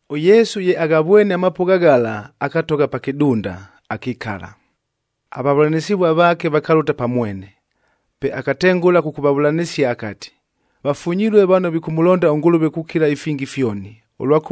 ɄYesu ye aghavwene amapʉgha ghala, akatogha pa kɨdunda, akikala. Avavʉlanɨsɨvuaa vaake vakalʉta pa mwene. Pe akatengʉla kʉkʉvavʉlanɨsia akati, “Vafunyilue vano vikʉmʉlonda ʉNgʉlʉve kukila ifingi fyoni,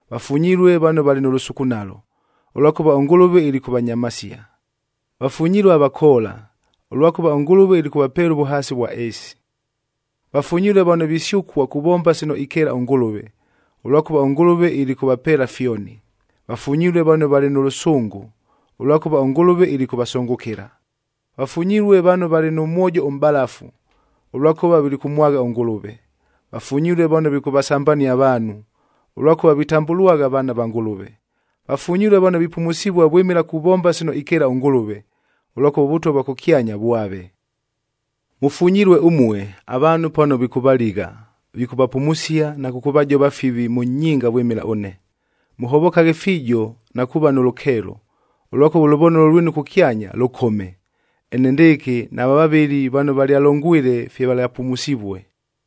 Vafunyilue vano valɨ nʉ lʉsukunalo, ʉlwakʉva ʉNgʉlʉve ilikʉvanyamasia. Vafunyilue avakoola,c ʉlwakʉva ʉNgʉlʉve ilikʉvapeela ʉvʉhaasi ʉvwa ɨɨsi. Vafunyilue vano visyʉkua kuvomba sino ikeela ʉNgʉlʉve,d ʉlwakʉva ʉNgʉlʉve ilikʉvapeela fyoni. Vafunyilue vano valɨ nʉ lʉsʉngʉ, ʉlwakʉva ʉNgʉlʉve ilikʉvasʉngʉkɨla. Vafunyilue vano valɨ nʉ mwojo ʉmʼbalafu, ʉlwakʉva vilikʉmwagha ʉNgʉlʉve. Vafunyilue vano vikʉvasambania avaanhu, ʉlwakʉva vitambʉlwagha vaana va Ngʉlʉve. Vafunyilue vano vipumusivua vwɨmɨla kuvomba sino ikeela ʉNgʉlʉve, ʉlwakʉva ʉVʉtwa vwa kʉkyanya vwave. “Mʉfunyilue ʉmue, avaanhu pano vikʉvaligha, vikʉvapumusia na kʉkʉvajova fivi mʉ nyinga vwɨmɨla ʉne. Mʉhovokaghe fiijo na kuuva nʉ lʉkeelo, ʉlwakʉva ʉlʉvonolo lwinu kʉkyanya, lʉkome. Enendɨɨkɨ nava vavɨli vano valyalongwile fye valyapumusivue.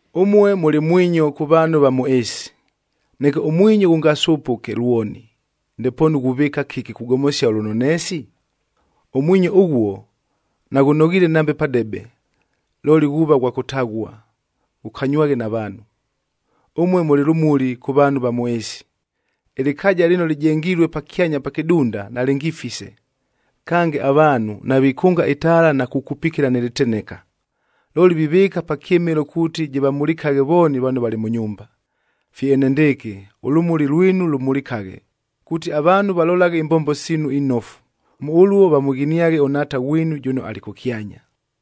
“Ʉmue mʉlɨ mwinyo kʉ vaanhu va mʉ ɨɨsi. Neke ʉmwinyo ghʉngasʉpʉke lwoni, ndepoonu ghuvɨɨka kɨki kugomosia ʉlʉnoneesi? Ʉmwinyo ʉghuo, naghʉnoghiile nambe padebe, looli ghuuva ghwa kʉtaghua, ghʉkanywaghe na vaanhu. “Ʉmue mʉlɨ lʉmuli kʉ vaanhu va mʉ ɨɨsi. Ɨlɨkaaja lɨno lɨjengilue pakyanya pa kɨdunda, nalɨngifise. Kange, avaanhu navikʉnga ɨtaala na kukupikila nɨ lɨteneka, looli vivɨɨka pa kyɨmɨlo kuuti jɨvamulikaghe vooni vano valɨ mʉ nyumba. Fye enendɨɨkɨ, ʉlʉmuli lwinu lʉmulikaghe, kuuti avaanhu valolaghe imbombo siinu inofu, mʉ ʉluo vamʉghiniaghe ʉNhaata ghwinu jʉno alɨ kʉkyanya.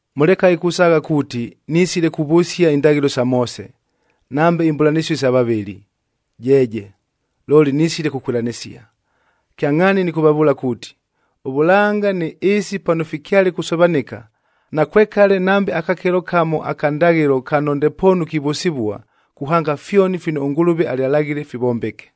“Mʉlekaghe kusaagha kuuti, nisile kuvʉsia indaghɨlo sa Moose, nambe imbʉlanɨsio isa vavɨli, jeeje! Looli nisile kukwɨlanɨsia. Kyangʼhaani nɨkʉvavʉʉla kuuti, ʉvʉlanga nɨ ɨɨsi pano fikyale kusovanɨka, nakwekale nambe akakelo kamo aka ndaghɨlo kano ndepoonu kivʉsɨvua, kuhanga fyoni fino ʉNgʉlʉve alyalaghile, fivombeke.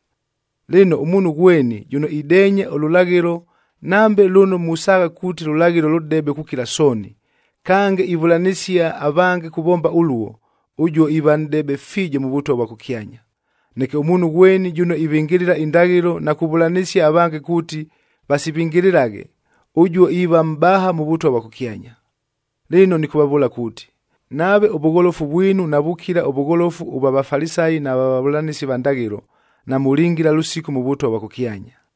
Lɨno, ʉmuunhu ghweni jʉno ideenya ʉlʉlaghɨlo, nambe lʉno musaagha kuuti lʉlaghɨlo lʉdebe kukila sooni, kange ivʉlanɨsia avange kuvomba ʉluo, ʉjuo iiva nʼdebe fiijo mʉ Vʉtwa vwa kʉkyanya. Neke ʉmuunhu ghweni jʉno ivɨngɨlɨla indaghɨlo na kuvʉlanɨsia avange kuuti vasivɨngɨlɨlaghe, ʉjuo iiva mʼbaha mʉ Vʉtwa vwa kʉkyanya. Lɨno, nɨkʉvavʉʉla kuuti, nave ʉvʉgholofu vwinu navukila ʉvʉgholofu ʉvwa Vafalisayie nʉ vwa vavʉlanɨsi va ndaghɨlo, namʉlingila lʉsiku mʉ Vʉtwa vwa kʉkyanya.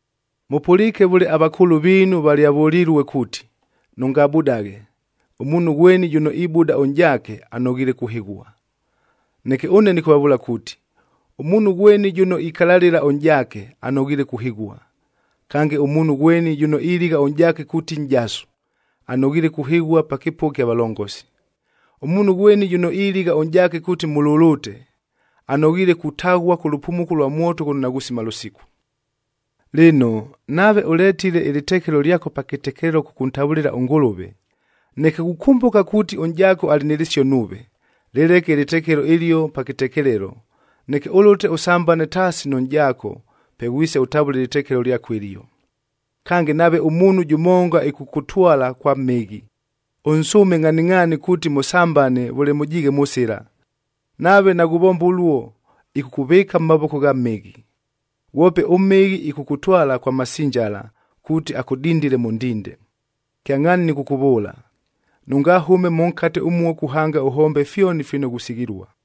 “Mʉpʉliike vʉle avakʉʉlʉ viinu valyavʉlilue kuuti, ‘Nʉngabudaghe,f ʉmuunhu ghweni jʉno ibʉda ʉnʼjaake, anoghiile kuhɨghua.’ Neke ʉne nɨkʉvavʉʉla kuuti, ʉmuunhu ghweni jʉno ikalalɨla ʉnʼjaake, anoghiile kuhɨghua. Kange, ʉmuunhu ghweni jʉno iligha ʉnʼjaake kuuti nʼjasu, anoghiile kuhɨghua pa kɨpʉgha kya valongosi. Ʉmuunhu ghweni jʉno iligha ʉnʼjaake kuuti mʉlʉlʉte, anoghiile kutaghua kʉ lʉpumuko lwa mwoto ghʉno naghusima lʉsiku! “Lɨno, nave ʉletile ɨlɨtekelo lyako pa kɨtekelelo kʉkʉntavʉlɨla ʉNgʉlʉve, neke ghukʉmbʉka kuuti ʉnʼjaako alɨ nɨ lɨsio nuuve, lɨleke ɨlɨtekelo ɨlio pa kɨtekelelo, neke ʉlʉte ʉsambane taasi nʉ nʼjaako, pe ghwise ʉtavʉle ɨlɨtekelo lyako ɨlio. “Kange, nave ʉmuunhu jʉmonga ɨkʉkʉtwala kwa mhɨghi, ʉnsʉʉme ngʼhaningʼhaani kuuti mʉsambane vʉle mʉjiighe mʉ sɨla. Nave naghuvomba ʉluo, ɨkʉkʉvɨɨka mʉ mavoko gha mhɨghi. Ghwope ʉmhɨghi ɨkʉkʉtwala kwa masinjala kuuti akʉdindile mʉ ndinde. Kyangʼhaani nɨkʉkʉvʉʉla, nʉngahʉme mʉnkate ʉmuo kuhanga ʉhombe fyoni fino ghusighilua!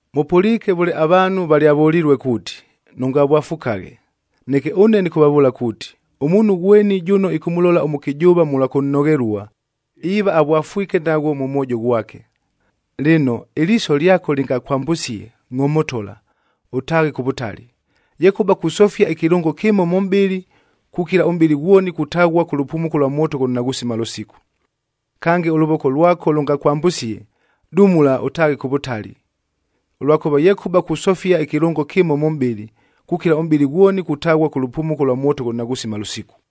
“Mʉpʉliike vʉle avaanhu valyavʉlilue kuuti, Neke ʉne nɨkʉvavʉʉla kuuti, ʉmuunhu ghweni jʉno ɨkʉmʉlola ʉmʉkɨjʉʉva mʉlwa kʉnnoghelua, iiva avwafwike naghwo mʉ mwojo ghwake. Lɨno, ɨliiso lyako lɨngakwambʉsie, ngʼomotola, ʉtaaghe kʉ vʉtali. Yekʉba kusofia ɨkɨlʉngo kɨmo mʉ mʼbɨlɨ, kukila ʉmʼbɨlɨ ghwoni kutaghua kʉ lʉpumuko lwa mwoto ghʉno naghusima lʉsiku. Kange, ʉlʉvoko lwako lʉngakwambʉsie, dumula ʉtaaghe kʉ vʉtali. Ʉlwakʉva yekʉba kusofia ɨkɨlʉngo kɨmo mʉ mʼbɨlɨ, kukila ʉmʼbɨlɨ ghwoni kutaghua kʉ lʉpumuko lwa mwoto ghʉno naghusima lʉsiku.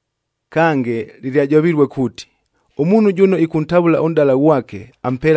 “Kange, lɨlyajovilue kuuti, ‘Ʉmuunhu jʉno ɨkʉntavʉla ʉnʼdala ghwake,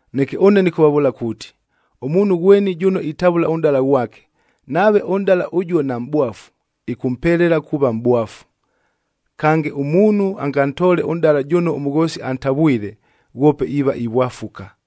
Neke ʉne nɨkʉvavʉʉla kuuti, ʉmuunhu ghweni jʉno itavʉla ʉnʼdala ghwake, nave ʉnʼdala ʉjuo namʼbwafu, ɨkʉmpelela kuuva mʼbwafu. Kange, ʉmuunhu angatoole ʉnʼdala jʉno ʉmʉghoosi antavwile, ghwope iiva ivwafuka.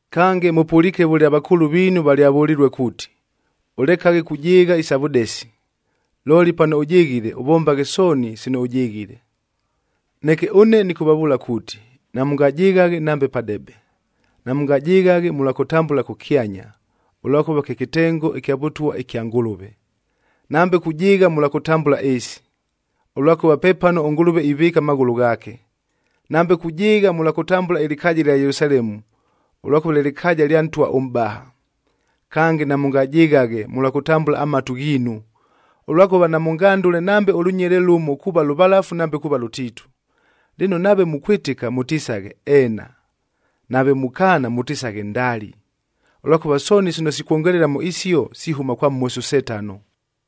“Kange, mʉpʉliike vʉle avakʉʉlʉ viinu valyavʉlilue kuuti, ʉlekaghe kujɨɨgha isa vʉdesi, ‘Looli pano ʉjɨghile, ʉvombaghe sooni sino ʉjɨghile.’ Neke ʉne nɨkʉvavʉʉla kuuti, namʉngajɨghaghe nambe padebe. Namʉngajɨghaghe mʉlwa kʉtambʉla kʉkyanya, ʉlwakʉva kye kɨtengo ɨkya Vʉtwa ɨkya Ngʉlʉve; nambe kujɨɨgha mʉlwa kʉtambʉla ɨɨsi, ʉlwakʉva pepano ʉNgʉlʉve ivɨɨka amaghʉlʉ ghaake;i nambe kujɨɨgha mʉlwa kʉtambʉla ɨlɨkaaja ɨlya Yelusalemu, ʉlwakʉva lye lɨkaaja lya Ntwa ʉMʼbaha. Kange, namʉngajɨghaghe mʉlwa kʉtambʉla amatu ghiinu, ʉlwakʉva namʉngandʉle nambe ʉlʉnyele lʉmo kuuva lʉvalafu nambe kuuva lʉtiitu. Lɨno, nave mukwɨtɨka, mʉtisaghe, ‘Eena,’ nave mukaana mʉtisaghe, ‘Ndali,’ ʉlwakʉva sooni sino sikwongelela mʉ isio, sihʉma kwa Mhosi ʉSetano.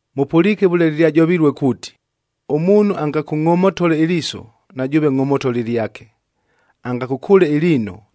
“Mʉpʉliike vʉle lɨlyajovilue kuuti, ‘Ʉmuunhu angakʉngʼomotole ɨliiso, na jʉʉve ngʼomotola ɨlyake, angakʉkʉʉle ɨliino,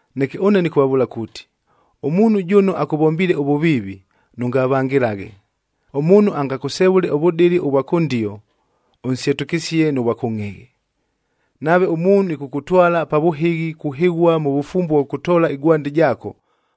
Neke ʉne nɨkʉvavʉʉla kuuti, ʉmuunhu jʉno akʉvombiile ʉvʉviivi, nʉngavangɨlaghe. Ʉmuunhu angakʉsevʉle ʉvʉdɨlɨ ʉvwa kʉndio, ʉnsyetʉkɨsie nʉ vwa kʉngʼhɨghɨ. Nave ʉmuunhu ɨkʉkʉtwala pa vʉhɨghi kuhɨghua mʉ vʉfumbue ʉvwa kʉtoola ɨgwandi jaako,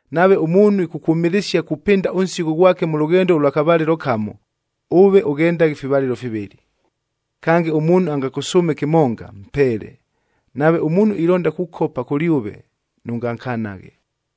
Nave ʉmuunhu ɨkʉkwʉmɨlɨsia kupɨnda ʉnsigho ghwake mʉ lʉghendo ʉlwa kavalɨlo kamo,l ʉve ʉghendaghe ifivalɨlo fivɨlɨ. Kange, ʉmuunhu angakʉsʉʉme kɨmonga, mpeele. Nave ʉmuunhu ilonda kukopa kʉlyʉve, nʉngankanaghe.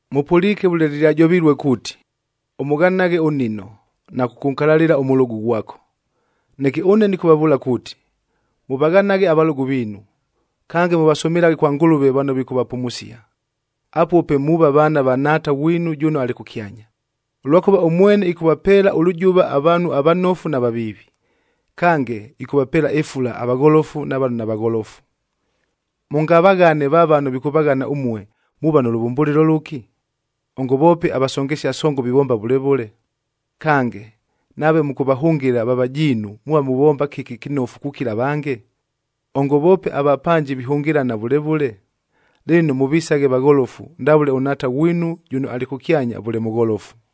“Mʉpʉliike vʉle lɨlyajovilue kuuti, ‘Ʉmʉghanaghe ʉnnino,m na kʉkʉnkalalɨla ʉmʉlʉgʉ ghwako.’ Neke ʉne nɨkʉvavʉʉla kuuti, mʉvaghanaghe avalʉgʉ viinu, kange mʉvasʉmɨlaghe kwa Ngʉlʉve vano vikʉvapumusia. Apuo pe muuva vaana va Nhaata ghwinu jʉno alɨ kʉkyanya, ʉlwakʉva ʉmwene ɨkʉvapeela ʉlʉjʉva avaanhu avanofu na vaviivi. Kange, ɨkʉvapeela ɨfula avagholofu na vano navagholofu. Mʉngavaghane va vano vikʉvaghana ʉmue, muuva nʉ lʉvʉmbʉlɨlo lʉki? Ongo voope avasongesia songon vivomba vʉle vʉle. Kange, nave mʉkʉvahʉngɨla va vajiinu muuva muvomba kɨki ɨkɨnofu kukila avange? Ongo voope avapanji vihʉngɨlana vʉle vʉle. Lɨno, mʉvisaghe vagholofu ndavʉle ʉNhaata ghwinu jʉno alɨ kʉkyanya vʉle mʉgholofu.